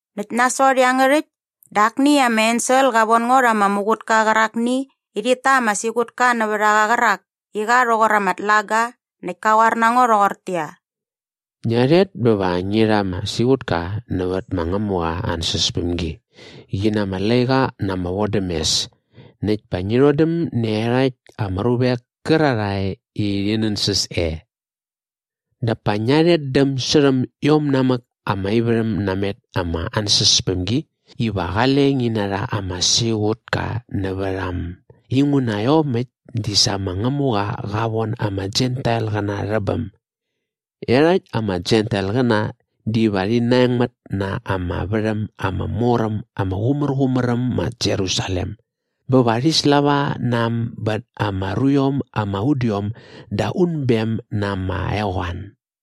Näkt nasot iangärhäkt dä akni ama ensel qa von ngo rha ama muqutka qärakni i rhit ta ama siqutka nävät a qa qärak i qa rhoqor ama tlaga näkt ka qoar na ngo rhoqortäqyia, “Ngia rhet bä va ngi rha ama siqutka nävät ma Ngämuqa aa ansäspämgi qi na ama laiqa na ama vodämes näkt pa ngi rhodäm nä iarhakt ama ruvek kärarhae i rhi nänsäs e. Dap pa ngia rhetdäm särhäm iom namäk ama ivärhäm namet ama ansäspämgi iva qale ngi narha ama siqutka nävät a äm inguna iomäkt di sa ma Ngämuqa qa von ama Jentailqäna rhä bäm. Iarhakt ama Jentailqäna diva rhi naengmät na ama värhäm ama mor äm ama qumärqumär äm ma Jerusalem bä va rhi slava na äm bät ama ruiom ama udiom da unbem na ama eqoan.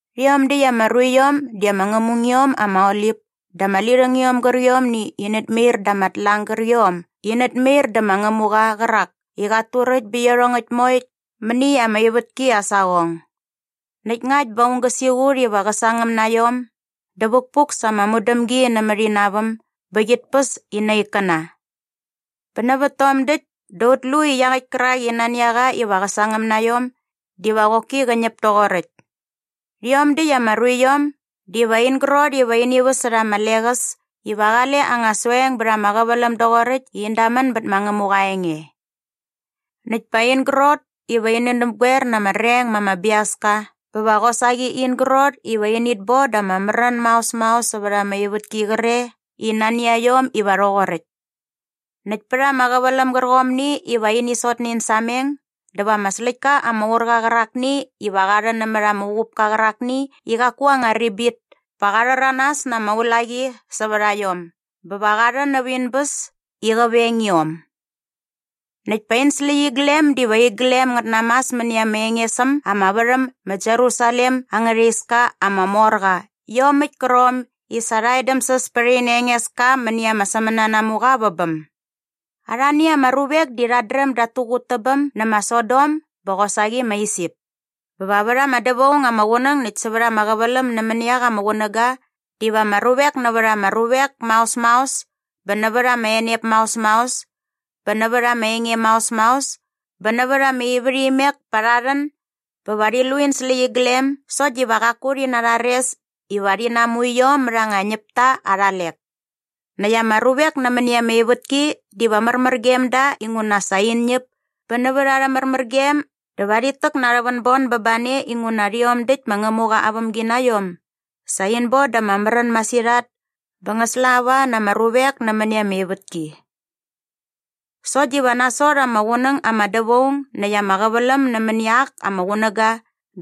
Rhiom däkt ama ruiom di ama ngämungiom ama olip dä ama lirhängiom gärqiomni i inät mair da ama tlang gärqiom i inät mair dä ma Ngämuqa qärak i qat turäkt bä iarhongäkt moe mäni ama ivätki aa saqong. Näkt ngakt bä aung gä siqut iva qä sangäm na iom dä vukpuk sa ama mudämgi nämät ina väm bä qit päs ina ikkäna. Bä nävät tom däkt dä ut lu i iaqäkt kärak i nani a qa iva qä sangäm na iom diva qoki qä ñäp toqoräkt. Rhiom däkt ama ruiom diva in grot iva ini väsärha ama leqäs iva qale anga soeng bät ama qäväläm doqoräkt i in damän bät ma Ngämuqa aa enge. Näkt pa in grot iva ini näpgoer na ama reng ma ama biaska bä va qosaqi in grot iva init bon da ama märän maos maos sävät ama ivätki qre i nani a iom iva rhoqoräkt. Näkt pät ama qäväläm gärqomni iva ini sot nä in sameng dä va ama släktka ama ur qa qärakni iva qa rhän nämät ama uqupka qärakni i qaku aa anga ribit pa qa rhäranas na ama ulaqi sävät a iom bä va qa rhän näp in bäs i qä veng iom. Näkt pa in släqyiglem diva iglem ngät namas mäni ama enges äm ama värhäm ma Jerusalem angärha iska ama mor qa iomäkt kärqom i sa rha edämsäs pät ina Engeska mäni ama sämänanamuqa vä bäm. Arhani ama ruvek di rhat dräm dat tuqut tä bäm nä ma Sodom bä qosaqi ma Isip. Bä va vät ama dävaung ama qunäng näkt sävät ama qäväläm nämäni ak ama qunäga diva ama ruvek nävät ama ruvek maos maos bä nävät ama enep maos maos bä nävät ama enge maos maos bä nävät ama ivärhimek pa rha rhän bä va rhi lu in släqyiglem sokt diva qaku rhi narhares iva rhi namu iom mät anga ñäpta arha lek. Näkt ama ruvek nämäni ama ivätki diva märmär gem da inguna sa in ñäp bä nävät arhä märmärgem dä va rhit täk na ama vänbon bä ba ne inguna rhiom däkt ma Ngämuqa aa vämginaiom sa in bon da ama märän masirhat bä ngä slava na ama ruvek nämäni ama ivätki. Sokt diva nasot ama qunäng ama dävaung näkt ama qäväläm nämäni ak ama qunäga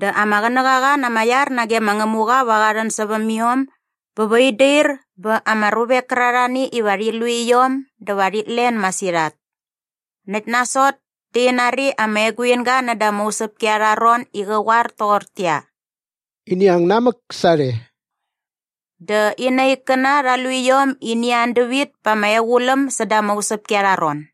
dä ama qänäqaqa na ama iar nage ma Ngämuqa va qa rhän säväm iom bä va in dair bä ama ruvek kärarhani iva rhi lu iom dä va rhit len masirhat. Näkt nasot dä in nari ama eguinga näda ama usäpki arha ron i qä qoar toqortäqyia, “Ini ang namäk sarhe.” Dä ina ikkäna rha lu iom i ini an dävit pa ama equläm säda ama usäpki arha ron.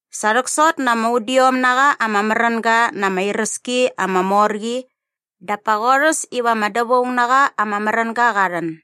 Sa rhäksot na ama udiom na qa ama märänga na ama iräski ama mor qi dap pa qorhäs iva ama dävaung na qa ama märänga qa rhän.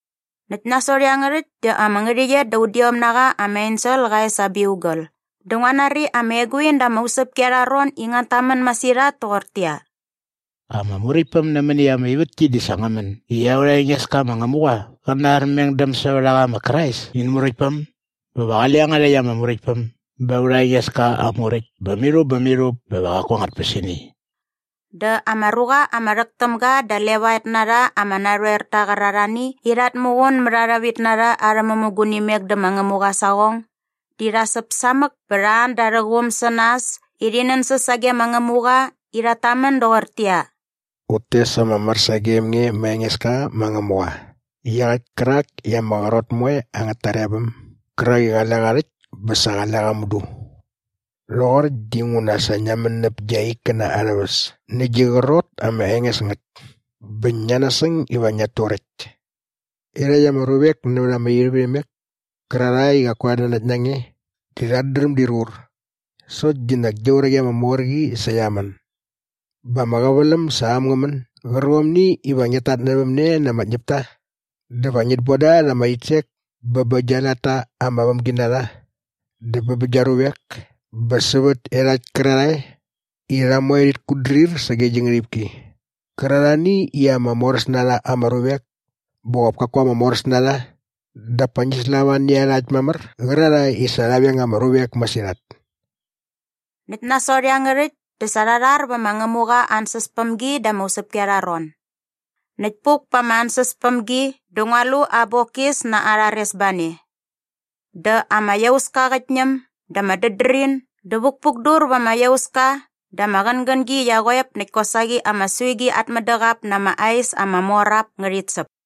Näkt nasot iangärhäkt dä ama ngärhäqyet da udiom na qa ama ensel qa es aa biugal dä ngua nari ama eguin da ama usäpki arha ron i ngät tamän masirhat toqortäqyia, “Ama muräktpäm nämäni ama ivätki di sa ngä män i aurha Engeska ma Ngämuqa qä na aa armengdämsävärhaqa ma Krais in Muräktpäm bä va qale iangärhäkt ama Muräktpäm ba aurha Engeska aa muräkt bä mirhup bä mirhup bä va qaku angät tpäsini!” Dä ama ruqa ama rhäk täm ga da levaet na rha ama narhoerta qärarhani i rhat muqun mät arhä vitnarha arhä mämugunimek dä ma Ngämuqa aa saqong di rha säp samäk bä rha an da arhä quum sä nas i rhi nänsäs sage ma Ngämuqa i rhat tamän doqortäqyia, “Ut tes ama mär sagem nge ma Engeska ma Ngämuqa iaqäkt kärak i ama qrot moe angät tarebäm gärak i qale qa rhäkt bä sa qale qa mudu. Rhoqoräkt dinguna sa ngia män näp gia ikkäna arhä väs nä gi qrot ama enges ngät bä ngia nasäng iva ngiat turäkt. Iarhakt ama ruvek nävät ama ivärhimek kärarhae i qaku rhat nanakt na nge di rhat dräm dir qur sokt di nak gia uraqi ama mor qi sa qia män. Bä ama qäväläm sa äm ngä män gärqomni iva ngiat tatnävämne na ama ñäpta dä va ngit bon da ama rhitsek bä bä gia latta ama vämginarha dä bä bä gia ruvek bä sävät iarhakt kärarhae i rha moe rhit kutdrir sage gi ngärhipki kärarhani i ama moräs na rha ama ruvek bä qop kaku ama moräs na rha dap pa ngi slava nä iarhakt mamär qärarhae i sa rha veng ama ruvek masirhat.” Näkt nasot iangärhäkt dä sa rha rhar vä ma Ngämuqa aa ansäspämgi da ama usäpki arha ron. Näkt puk pa ama ansäspämgi dä ngua lu aa bokis na aa rharesbane. Dä ama iauska qät ñäm dä ama dädrin dä vukpukdur va ama iauska dä ama qängängi qia qoep näkt kosaqi ama suigi at mädäqap na ama ais ama mor ap ngärhit säp.